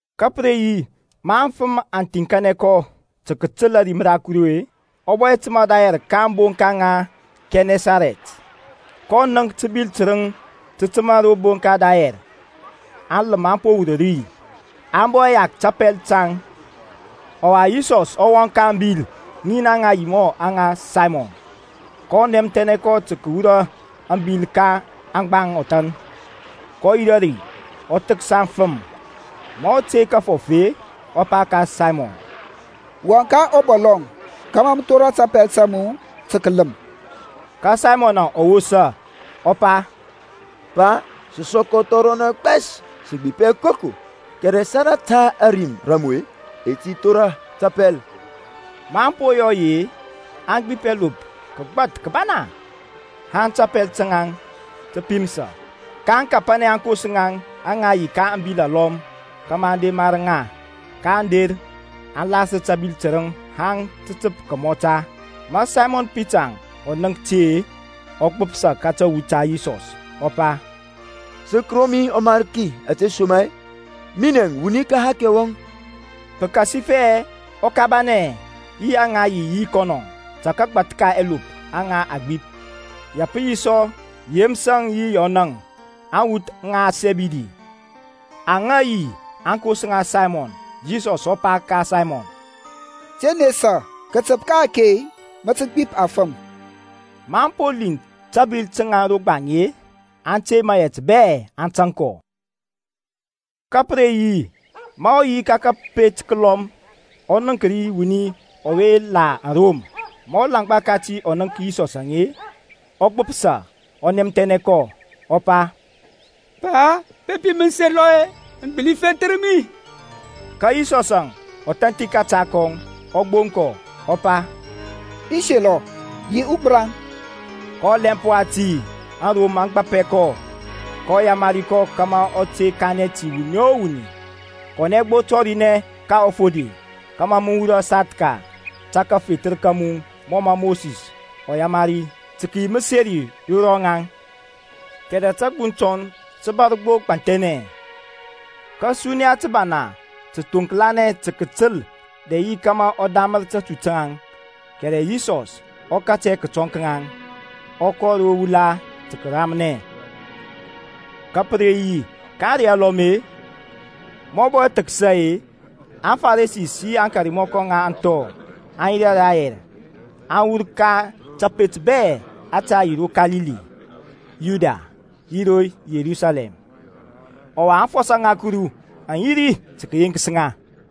Ka pə re yi ma aŋfəm aŋ thiŋkanɛ kɔ tə kətəl ȧrim ra Kuru-e, ɔ bɔ təmȧ rayɛr ka ȧŋbonka ŋa Kɛnɛsarɛt. kɔ nənk təbil tərəŋ tə təmȧ ro bonka rayɛr; aŋləm aŋ po wur ri, aŋ bɔ yak tapɛl taŋ. Ɔwa Yisɔsȧŋ ɔ wɔŋ ka abil ŋin aŋa yi aŋa Saymɔn, kɔ nɛmthɛnɛ kɔ tə kəwura ȧŋbil ka aŋgbaŋ ɔthan. Kɔ yirȧ ri, ɔ thəksa aŋfəm. Ma ɔ tey kəfɔf-e, ɔ pa ka Saymɔn, Wɔŋ ka ɔbɔlɔŋ kȧmȧ mə thora tapɛl ta nu tə kələm. Ka Saymɔn ɔ wosa, ɔ pa, Pa, sə sɔkɔ thɔrɔnɛ gbɛs, sə gbip hɛ koko; kɛrɛ salata ȧrim ra mu-e, i ti thora tapɛl. Maŋ po yɔ yi-e, aŋ gbip ɛlop kəgbath kəbana, haŋ tapɛl taŋ tə pimsa. kaŋ kapanɛ aŋkos ŋaŋ aŋa yi ka ȧŋbil alɔm kȧmȧ aŋ der mar ŋa. Kaŋ der, aŋ lasər tabil tərəŋ haŋ tə təp kəmɔta. Ma Saymɔn Pita ɔ nənk ȧte-e, ɔ gbəpsa ka tawu ta Yisɔs, ɔ pa, Sək ro mi ɔMarki, ȧtesoma-e minɛ wuni ka ɛhakɛ wɔŋ. Pəkasifɛ ɔ kabanɛ, yi aŋa yi yi kɔnɔ, ta kagbath ka ɛlop aŋa aŋ gbip. Ya pə yi sɔ Yeməsȧŋ yi Yɔnȧŋ, aŋwuth ŋa Sɛbɛdi, aŋa yi aŋkos ŋa Saymɔn. Yisɔs ɔ pa ka Saymɔn, Te nesa, kətəp ka-ake mə tə gbip afəm. Maŋ po liŋ tabil taŋ ro gbaŋ-e aŋ tey mayɛt bɛ aŋ tȧŋ kɔ. Ka pə re yi ma ɔ yi ka kəpet kəlɔm ɔ nənk ri wuni ɔwe la arom. Ma ɔlaŋgba kati ɔ nənk Yisɔsȧŋ-e, ɔ gbəpsa, ɔ nɛmthɛnɛ kɔ, ɔ pa, Pa, bepi mə selɔ-e, mə gbəli fethər mi. Ka Yisɔsȧŋ ɔ thanthi kȧta kɔŋ, ɔ gboŋ kɔ, ɔ pa, I selɔ; yi ugbəraŋ. Ka ɔlɛmp wati aŋrom aŋ gbapɛ kɔ. kɔ yamari kɔ kȧmȧ ɔ te kanɛ ti wuni o wuni. Kɔnɛ gbo, tɔrinɛ ka ɔfode, kȧmȧ mə wurɔ sathka ta kafethər ka mu mɔ mə Mosis ɔ yamari, tə kəyi məseri ro rɔŋaŋ. Kɛrɛ tȧgbuŋ tɔŋ tə bȧr gbo gbanthɛnɛ, ka tey təbana tə thoŋklanɛ tə kətəl dɛ yi kȧmȧ ɔ damər tatu taŋ. Kɛrɛ Yisɔs ɔ katɛ kətɔŋ ka ŋaŋ, ɔ kɔ ro wula tə kəramnɛ. Ka pə re yi ka ȧŋrey alɔm-e, ma ɔ bɔ thəksa-e, aFaresi yi akarmɔkɔ ŋa aŋthɔ aŋ yirȧ rayɛr, aŋ wur ka tapet bɛ ȧte yi ro Kalili, Yudia, yi ro Yerusalɛm. Ɔwa aŋfɔsɔ ŋa Kuru aŋ yi ri tə kəyeŋkəs ŋa.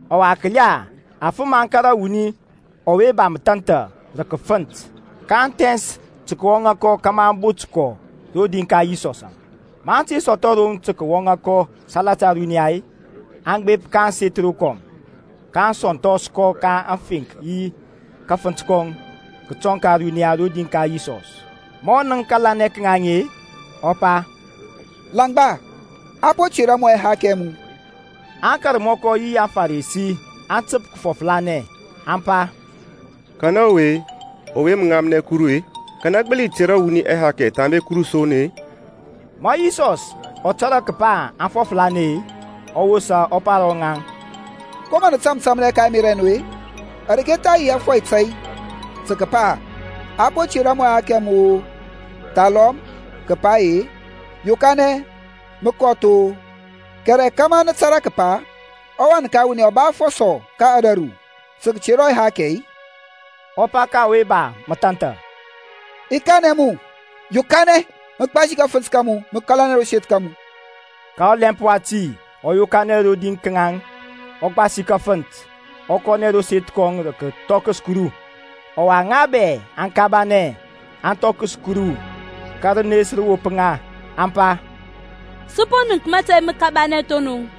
Ɔwa kəla, aŋfəm aŋ kȧrȧ wuni ɔwe ba məthanthaŋ rə kəfənt. Kaŋ thɛns tə kəwɔŋa kɔ kȧmȧ aŋ bot kɔ rodi ka Yisɔsȧŋ. Maŋ te sɔthɔ roŋ tə kəwɔŋa kɔ salata ȧruniya-e, aŋ gbep ka ȧŋseth rokɔm, kaŋ sɔnthɔs kɔ ka aŋfeŋk yi kafənt kɔŋ kətɔŋ ka ȧruniya rodi ka Yisɔs. Ma ɔ nənk kȧlanɛ ka ŋaŋ-e, ɔ pa, Langba, a po tera mu ɛhakɛ ɛ mu. Aŋkarmɔkɔ yi aŋFarisi aŋ təp kəfɔflanɛ, aŋ pa, Kanɛ ɔwe-e, ɔwe mə ŋamnɛ Kuru-e? Kanɛ gbəli tera wuni ɛhakɛ thambe Kuru son-e? Ma Yisɔs ɔ tȧrȧ kəpa aŋ fɔflanɛ-e, ɔ wosa ɔ pa ro ŋaŋ, Ko mə nə tȧmtȧmnɛ ka ɛmerȧ ɛ nu-e? Areke tha yi ȧfɔy tȧy tə kəpa-e, A po tera mu ɛhakɛ ɛ mu-o, thalɔm kəpa-e, Yokanɛ mə kɔth-o? Kɛrɛ kȧmȧ nə tȧrȧ kəpa ɔWan ka wuni ɔ ba afɔsɔ ka ȧdȧru tə kətera ɛhakɛ-e, ɔ pa ka ɔwe ba mathanthaŋ, I kanɛ mu, yokanɛ, mə gbasi kafənt ka mu, mə kȧlanɛ ro seth ka mu. Ka ɔlɛmp wati ɔ yokanɛ rodi ka ŋaŋ, ɔ gbasi kafənt, ɔ kɔnɛ ro seth kɔŋ rə kəthɔkəs Kuru. Ɔwa ŋa bɛ aŋ kabanɛ, aŋ thɔkəs Kuru, ka rənes rə wop ŋa, aŋ pa, Sə po nənk mȧtȧy məkabanɛ thonɔŋ.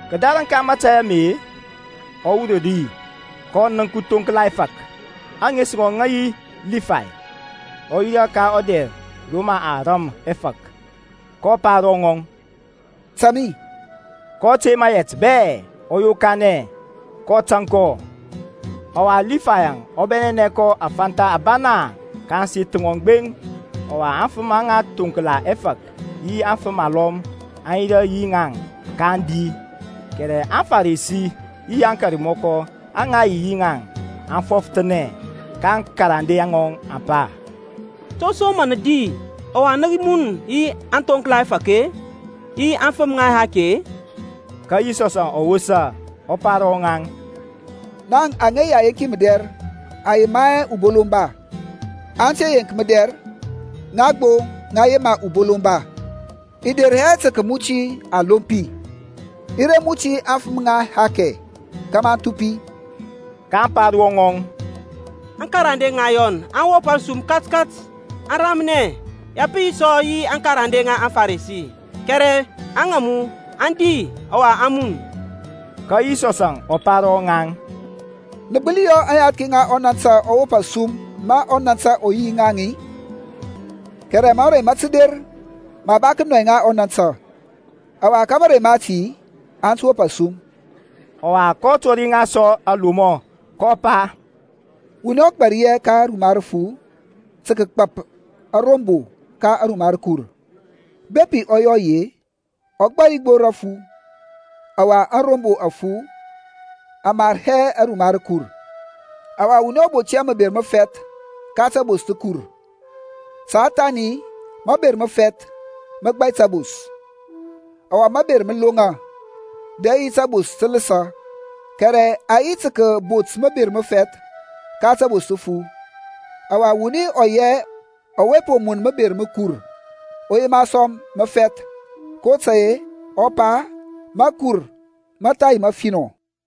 Kədarəŋ ka mȧtȧy ame-e, ɔ wur ri, kɔ nənk uthoŋkla ɛfȧk, ȧŋes ŋɔŋ ŋə yi Libay, ɔ yirȧ ka ɔdɛr rə mə a ram ɛfȧk. Kɔ pa ro ŋɔŋ, Tȧŋ mi. kɔ tey mayɛt bɛ, ɔ yokanɛ, kɔ tȧŋ kɔ. Ɔwa Lifayȧŋ ɔ bɛnɛnɛ kɔ afantha abana ka ȧŋseth ŋɔŋ gbeŋ, ɔwa aŋfəm aŋa thoŋkla ɛfȧk yi afəm alɔm aŋ yirȧ yi ŋaŋ ka kadi. Kɛrɛ aŋFarisi yi aŋkarmɔkɔ aŋa yi yi ŋaŋ aŋ fɔfəthanɛ ka aŋkarande ŋɔŋ, aŋ pa, To som mə nə di, ɔwa nə mun yi aŋthoŋkla ɛfȧk-e, yi aŋfəm ŋa ɛhakɛ-e? Ka Yisɔs ɔ wosa, ɔ pa ro rɔŋaŋ, Ŋaŋ aŋa yi ayenki mədɛr aŋ yema hɛ ubolomba, ante yeŋki mədɛr ŋa gbo ŋa yema ubolomba. I de hɛ tə kəmuti aŋlompi, i re muti aŋfəm ŋa ɛhakɛ kȧmȧ aŋ thupi. kaŋ pa ro rɔŋɔŋ, Aŋkarande ŋa Yɔn aŋ wop asum katkat, aŋ ramnɛ, ya pə yi sɔ yi aŋkarande ŋa aŋFarisi, kɛrɛ aŋa mu aŋ di ɔwa aŋ mun. Ka Yisɔs ɔ pa ro ŋaŋ, Nə gbəli yɔ aŋyathki ŋa ɔnantə aŋ wop asum ma ɔnantə ɔ yi yi ŋaŋ-i? Kɛrɛ mȧrey mə tə der ma a tə nɔy ŋa ɔnantə, ɔwa ka mȧrey mati aŋ tə wop asum. Ɔwa ɔ tɔri ŋa sɔ alomɔ, kɔ pa, Wuni ɔ gbari hɛ ka ruma rəfu tə kəgbȧp arombo ka ruma rəkur; bepi ɔ yɔ yi-e, ɔ gbari gbo rafu, ɔwa arombo afu aŋ mar hɛ aruma rəkur. Ɔwa wuni ɔ bot hɛ məber məfɛth ka təbos təkur, ta thani maber məfɛth mə gbai tabos, ɔwa maber mə loŋa, dɛ yi tabos tə ləsə, kɛrɛ a yi tə kəbot məber məfɛth ka təbos təfu. Ɔwa ɔwuni ɔ yi hɛ ɔwe po mun məber məkur, ɔ yema sɔ məfɛth; kotȧy-e ɔ pa, makur mə tha yi məfinɔ.